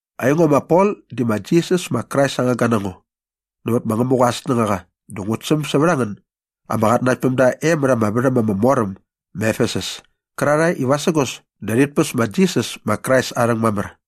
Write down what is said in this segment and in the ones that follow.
Aingo ma Pol di ma Jisas ma Krais aa ngangga na ngo nävät ma Ngämuqa aa snängaqa dä ngut säm sävät a ngän ama qatnanaktpämda e mät ama värhäm ama mor äm ma Efesus kärarhae i vasägos dä rhit päs ma Jisas ma Krais aa rhäng mamär.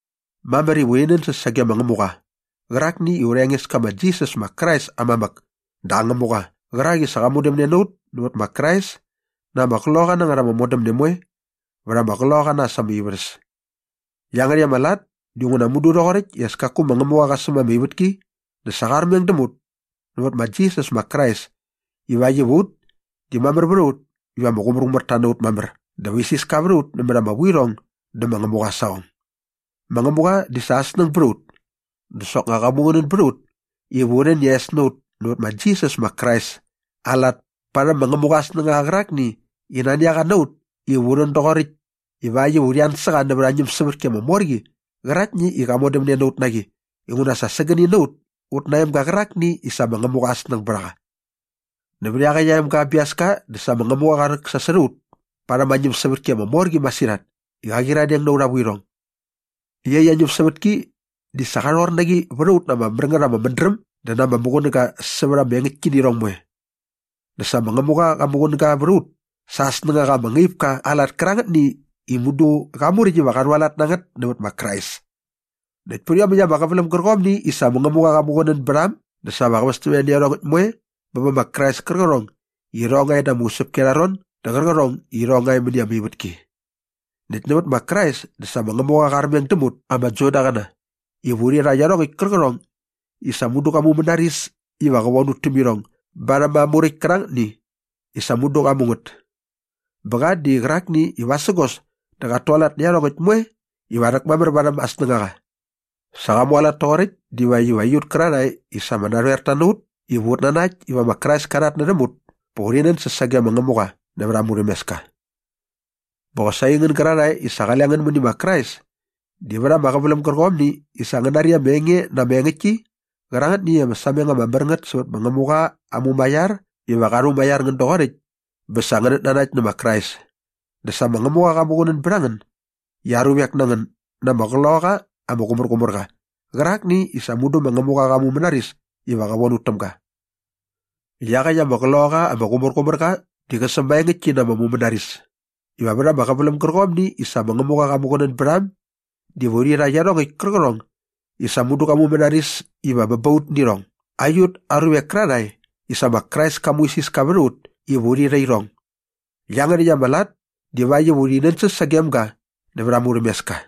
Mamär iva urhi nänsäs sage ma Ngämuqa qärakni i aurha Engeska ma Jisas ma Krais aa mamäk dä aa Ngämuqa qärak i sa qa modämne na ut nävät ma Krais na ama qloqaqa na ngät ama modämne moe vät ama qloqaqa na äs ama ivärhäs. Iangärhäkt ama lat dinguna mudu rhoqoräkt i as kaku ma Ngämuqa qa säm ama ivätki dä sa qa armeng däm ut nävät ma Jisas ma Krais ivakt iva ut di mamär vät a ut iva ama qumärqumärta na ut mamär dä va isiska vät a ut nämät ama vuirhong dä ma Ngämuqa aa saqong. Ma Ngämuqa di sa aa snäng bät a ut dä soknga qa muqunän bät a ut iva u rhän i aa es na ut nävät ma Jisas ma Krais aa lat parhäm ma Ngämuqa aa snängaqa qärakni i nani a qa na ut iva u rhän doqoräkt ivakt iva urhi an sä qa nävät aa ñämsävätki ama mor qi qäraktni i qa modämne na ut na qi inguna sa sägäni na ut ut na aa emga qärakni i sa ma Ngämuqa aa snäng bät a qa. Nävät iaqäkt aa emga aa biaska dä sa ma Ngämuqa qa rhäksasot a ut parhäm aa ñämsävätki ama mor qi masirhat i qa qyiradeng na aurha vuirhong. Iaqyäkt aa ñämsävätki di sa qa rhor na qi vät a ut na ama mär ngät ama mädräm dä na ama muqunäga sävät ama engäktkinirhong moe. Dä sa ma Ngämuqa qa muqunäga vät a ut sa aa snängaqa ama ngaip ka aa lat kärangätni i mudu qa muräkt iva qa rhualat na ngät nävät ma Krais. Näkt pät iomäkt ama qäväläm gärqomni i sa ma Ngämuqa qa muqunän bät a äm dä sa va qä västämne nä iarhongäkt moe bä bä ma Krais kärqärhong i irhong nga e da ama usäpki arha ron dä qärqärhong i irhong nga e mäni ama ivätki. Näkt nävät ma Krais dä sa ma Ngämuqa qa armeng däm ut ama Judaqäna iva urhi rha iarhongäkt kärqärhong i sa mudu qa mumänaris iva qä von ut täm irhong barhäm aa muräkt kärangätni i sa mudu qa mu ngät. Bä qa di qärakni i vasägos dä qat tualat nä iarhongäkt moe iva rhäktäkmamär varhäm aa snängaqa. Sa qa mualat toqoräkt divakt iva aiut kärarhae i sa ama narhoerta na ut iva ut nanakt iva ma Krais ka rhatnärhäm ut pa urhi nänsäs sage ma Ngämuqa nävät aa murhämeska. Bä qosaqi aingän gärarhae i sa qale ngän mäni ma Krais di vät ama qäväläm gärqomni i sa ngän nari ama enge na ama engäktki qärangätni i ama sameng ama mär ngät sävät ma Ngämuqa aa mumaiar iva qa rhumaiar ngän doqoräkt bä sa ngänät nanakt nä ma Krais di sa ma Ngämuqa qa muqunän bät a ngän i aa ruvek na ngän na ama Qloqaqa ama Qumärqumärqa qärakni i sa mudu ma Ngämuqa qa mumänaris iva qä von ut täm ga. Iaqäkt ama Qloqaqa ama Qumärqumärqa di qä sämaengäktki na ama mumänaris iva vät ama qäväläm gärqomni i sa ma Ngämuqa qa muqunän bät a äm diva urhi rha iarhongäkt kärqärhong i sa mudu qa mumänaris iva bä ba ut nä irhong aiut aa ruvek kärarhae i sa ma Krais ka muisiska vät a ut iva urhi rha irhong. Iangärhäkt ama lat divakt iva urhi nänsäs sagem ga nävät aa murhämeska.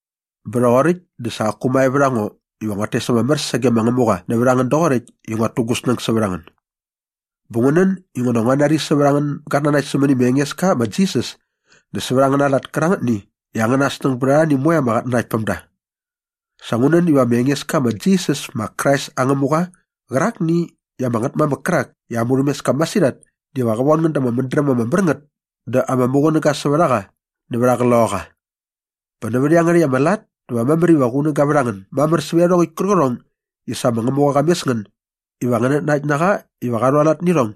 Bä rhoqoräkt dä sa qaku mae vät a ngo iva nguat tes ama mär sage ma Ngämuqa nävät a ngän doqoräkt i nguat tu gu snäng sävät a ngän. Bä ngu nän inguna sa ngua nari sävät angän gatnanakt sämäni ma Engeska ma Jisas dä sävät angäna lat kärangätni i angäna snäng bät arhani moe ama qatnanaktpämda. Sa ngu nän iva aurha Engeska ma Jisas ma Krais aa Ngämuqa qärakni i ama Ngätmamäk kärak i aa murhämeska masirhat diva qä von ngän da ama mädräm ama mär ngät dä ama muqunäga sävät a qa nävät aa Qloqaqa. Bä nävät iangärhäkt ama lat dä va mamär iva qunäga vät a ngän mamär sävät iarhongäkt kärqärhong i sa ma Ngämuqa qa mes ngän iva ngänät nanakt na qa iva qa rhualat nä irhong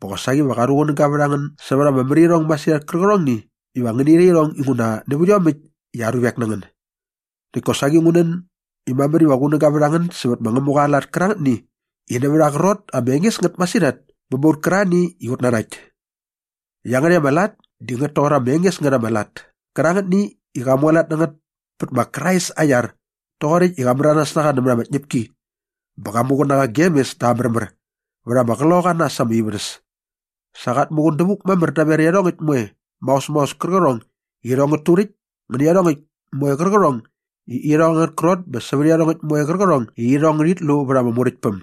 bä qosaqi va qunäga vät a ngän sävät ama märirhong masirhat kärqärhongni iva ngäni rha irhong inguna nävät iomäkt i aa ruvek na ngän. Näkt kosaqi ngu nän i mamär iva qunäga vät a ngän sävät ma Ngämuqa aa lat kärangätni i nävät aa qrot ama enges ngät masirhat bä ba ut kärarhani i ut nanakt. Iangärhäkt ama lat di ngät toqor ama enges ngät ama lat kärangätni i qa mualat na ngät pät ma Krais aa iar toqoräkt i qa märanas na qa nämät ama tñäpki bä qa muqun na qa gem mes da aa märmär vät ama qloqaqa na äs ama ivärhäs. Sa qat muqun dävuk mamär daver iarhongäkt moe maos maos kärqärhong i irhong ngät turäkt ngä nä iarhongäkt moe kärqärhong i irhong angät krot bä sävät iarhongäkt moe kärqärhong i irhong ngärhit lu vät ama muräktpäm.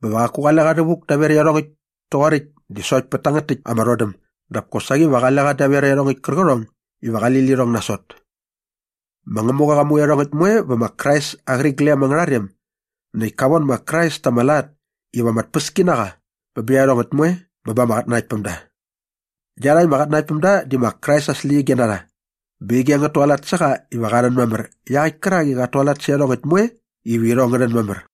Bä va qaku qale qa rhävuk daver iarhongäkt toqoräkt di sokt pät tangät täkt ama rhodäm dap kosaqi va qale qa daver iarhongäkt kärqärhong iva qali lirhong nasot. Ma Ngämuqa qa mu iarhongäkt moe vä ma Krais aa qäriglem angärha rem näkt ka von ma Krais ta ama lat iva ama tpäski na qa bä bä iarhongäkt moe bä ba ama qatnanaktpämda. Iarhakt ama qatnanaktpämda di ma Krais aa släqyige na rha bä ige ngät tualat sä qa iva qa rhän mamär iaqäkt kärak i qat tualat sä iarhongäkt moe iva irhong ngä rhän mamär.